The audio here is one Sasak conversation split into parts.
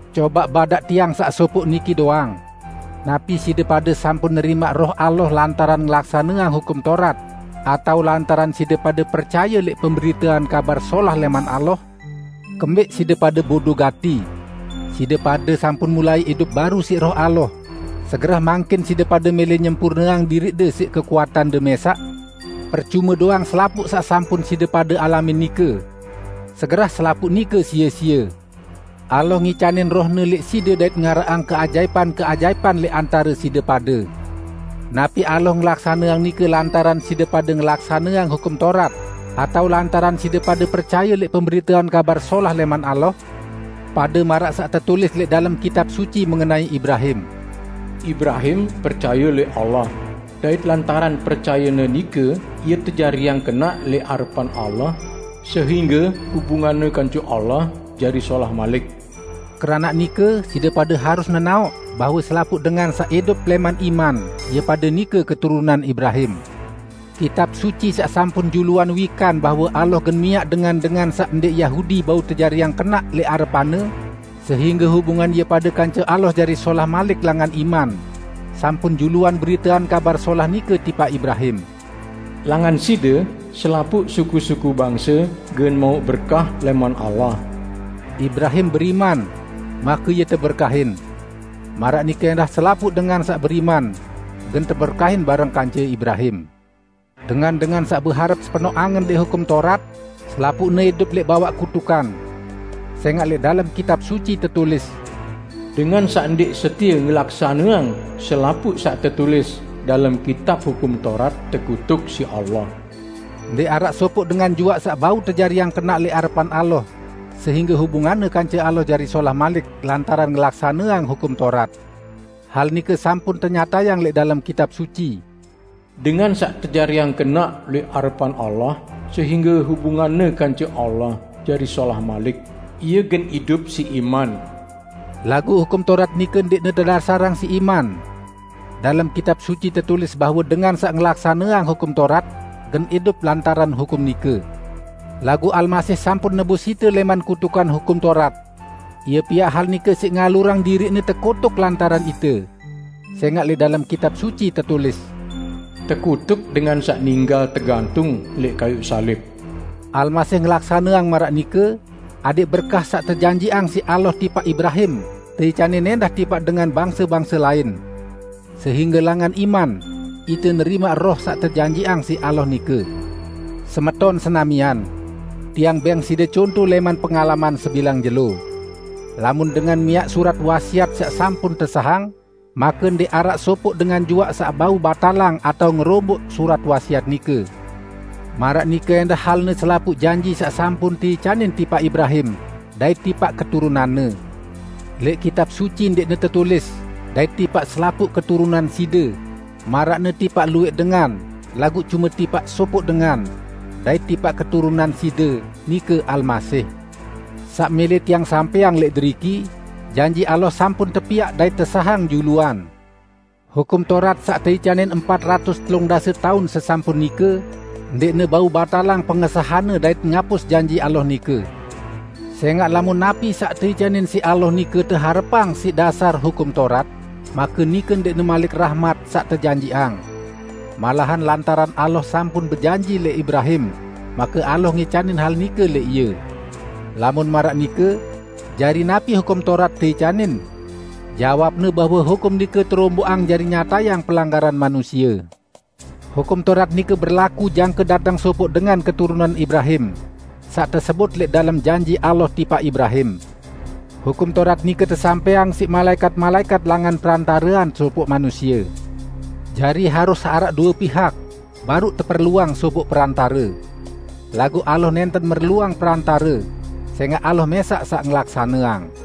Cobaq badaq tiang saq sopoq niki doang: Napi side pade sampun nerimaq Roh Allah lantaran ngelaksaneang Hukum Taurat, atao lantaran side pade percaye lẽq pemberitean Kabar Solah lẽman Allah? Kembẽq side pade bodo gati? Side pade sampun mulai idup baru siq Roh Allah, segerah mangkin side pade mẽlẽ nyempurneang diriqde siq kekuatande mẽsaq? Percume doang selapuq saq sampun side pade alamin nike? Segerah selapuq nike sie-sie! Allah ngicanin Roh-Ne lẽq side dait ngaraqang keajaipan-keajaipan lẽq antare side pade. Napi Allah ngelaksaneang nike lantaran side pade ngelaksaneang Hukum Taurat atao lantaran side pade percaye lẽq pemberitean Kabar Solah lẽman Allah? Pade maraq saq tetulis lẽq dalem Kitab Suci mengenai Ibrahim, "Ibrahim percaye lẽq Allah, dait lantaran percayenne nike ie tejariang kenaq lẽq arepan Allah sehingge hubunganne kance Allah jari solah malik." Keranaq nike, side pade harus nenaoq bahwe selapuq dengan saq idup lẽman iman, ie pade nike keturunan Ibrahim. Kitab Suci, saq sampun juluan wikan bahwe Allah gen miaq dengan-dengan saq ndẽq Yahudi bau tejariang kenaq lẽq arepan-Ne sehingge hubungan ie pade kance Allah jari solah malik langan iman, sampun juluan beriteang kabar solah nike tipaq Ibrahim, "Langan side, selapuq suku-suku bangse gen mauq berkah lẽman Allah." Ibrahim beriman, make ie teberkahin. Maraq nike ẽndah selapuq dengan saq beriman, gen teberkahin bareng kance Ibrahim. Dengan-dengan saq beharep sepenoq angen lẽq Hukum Taurat, selapuqne idup lẽq bawaq kutukan. Sẽngaq lẽq dalem Kitab Suci tetulis, "Dengan saq ndẽq setie ngelaksaneang selapuq saq tetulis dalem Kitab Hukum Taurat tekutuk siq Allah!" Ndẽq araq sopoq dengan juaq saq bau tejariang kenaq lẽq arepan Allah sehingge hubunganne kance Allah jari solah malik lantaran ngelaksaneang Hukum Taurat. Hal nike sampun tenyatayang lẽq dalem Kitab Suci, "Dengan saq tejariang kenaq lẽq arepan Allah sehingge hubunganne kance Allah jari solah malik, ie gen idup siq iman!" Laguq Hukum Taurat nike ndẽqne tedasarang siq iman. Dalem Kitab Suci tetulis bahwe dengan saq ngelaksaneang Hukum Taurat, gen idup lantaran hukum nike. Laguq Almasih sampun nebus ite lẽman kutukan Hukum Taurat. Ie piaq hal nike siq ngalurang diriq-Ne tekutuk lantaran ite. Sẽngaq lẽq dalem Kitab Suci tetulis, "Tekutuk dengan saq ninggal tegantung lẽq kayuq salib." Almasih ngelaksaneang maraq nike adẽq berkah saq tejanjiqang siq Allah tipaq Ibrahim teicanin ẽndah tipaq dengan bangse-bangse lain. Sehingge langan iman, ite nerimaq Roh saq tejanjiqang siq Allah nike. Semeton senamian! Tiang bẽng side conto lẽman pengalaman sebilang jelo. Lamun dengan miaq surat wasiat saq sampun tesahang, make ndẽq araq sopoq dengan juaq saq bau batalang atao ngeromboq surat wasiat nike. Maraq nike ẽndah halne selapuq janji saq sampun teicanin tipaq Ibrahim dait tipaq keturunanne. Lẽq Kitab Suci ndẽqne tetulis "dait tipaq selapuq keturunan side", maraqne tipaq luwẽq dengan, laguq cume tipaq sopoq dengan, "dait tipaq keturunan side", nike Almasih. Saq mẽlẽ tiang sampẽang lẽq deriki: Janji Allah sampun tepiaq dait tesahang juluan. Hukum Taurat saq teicanin empat ratus telung dase taun sesampun nike ndẽqne bau batalang pengesahanne dait ngapus janji Allah nike. Sẽngaq lamun napi saq teicanin siq Allah nike teharepang siq dasar Hukum Taurat, make nike ndẽqne malik rahmat saq tejanjiqang. Malahan lantaran Allah sampun bejanji lẽq Ibrahim, make Allah ngicanin hal nike lẽq ie. Lamun maraq nike, jari napi Hukum Taurat teicanin? Jawabne bahwe hukum nike teromboqang jari nyatayang pelanggaran manusie. Hukum Taurat nike berlaku jangke dateng sopoq dengan keturunan Ibrahim, saq tesebut lẽq dalem janji Allah tipaq Ibrahim. Hukum Taurat nike tesampẽang siq malaẽkat-malaẽkat langan perantarean sopoq manusie. Jari, harus araq due pihak, baruq teperluang sopoq perantare. Laguq Allah nẽnten merluang perantare, sẽngaq Allah mẽsaq saq ngelaksaneang.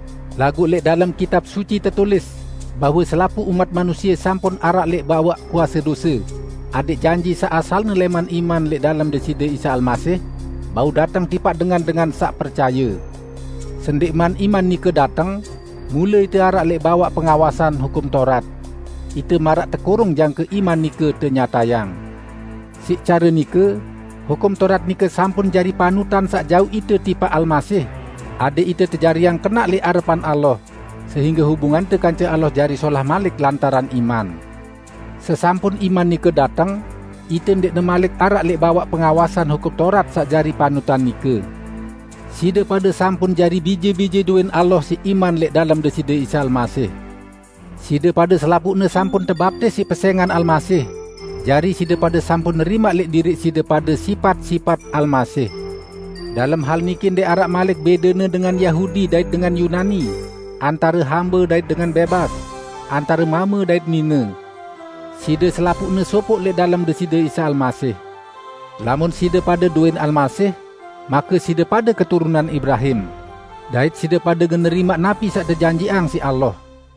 Laguq lẽq dalem Kitab Suci tetulis bahwe selapuq umat manusie sampun araq lẽq bawaq kuase dose, adẽq janji saq asalne lẽman iman lẽq dalem Deside Isa Almasih bau dateng tipaq dengan-dengan saq percaye. Sendẽqman iman nike dateng, mule ite araq lẽq bawaq pengawasan Hukum Taurat. Ite maraq tekurung jangke iman nike tenyatayang. Siq care nike, Hukum Taurat nike sampun jari panutan saq jauq ite tipaq Almasih, adẽq ite tejariang kenaq lẽq arepan Allah sehingge hubungante kance Allah jari solah malik lantaran iman. Sesampun iman nike dateng, ite ndẽqne malik araq lẽq bawaq pengawasan Hukum Taurat saq jari panutan nike. Side pade sampun jari bije-bije dowẽn Allah siq iman lẽq dalem Deside Isa Almasih. Side pade selapuqne sampun tebaptis siq pesẽngan Almasih, jari side pade sampun nerimaq lẽq diriq side pade sipat-sipat Almasih. Dalem hal niki ndẽq araq malik bẽdene dengan Yahudi dait dengan Yunani, antare hambe dait dengan bẽbas, antare mame dait nine. Side selapuqne sopoq lẽq dalem Deside Isa Almasih. Lamun side pade dowẽn Almasih, make side pade keturunan Ibrahim. Dait side pade gen nerimaq napi saq tejanjiqang siq Allah.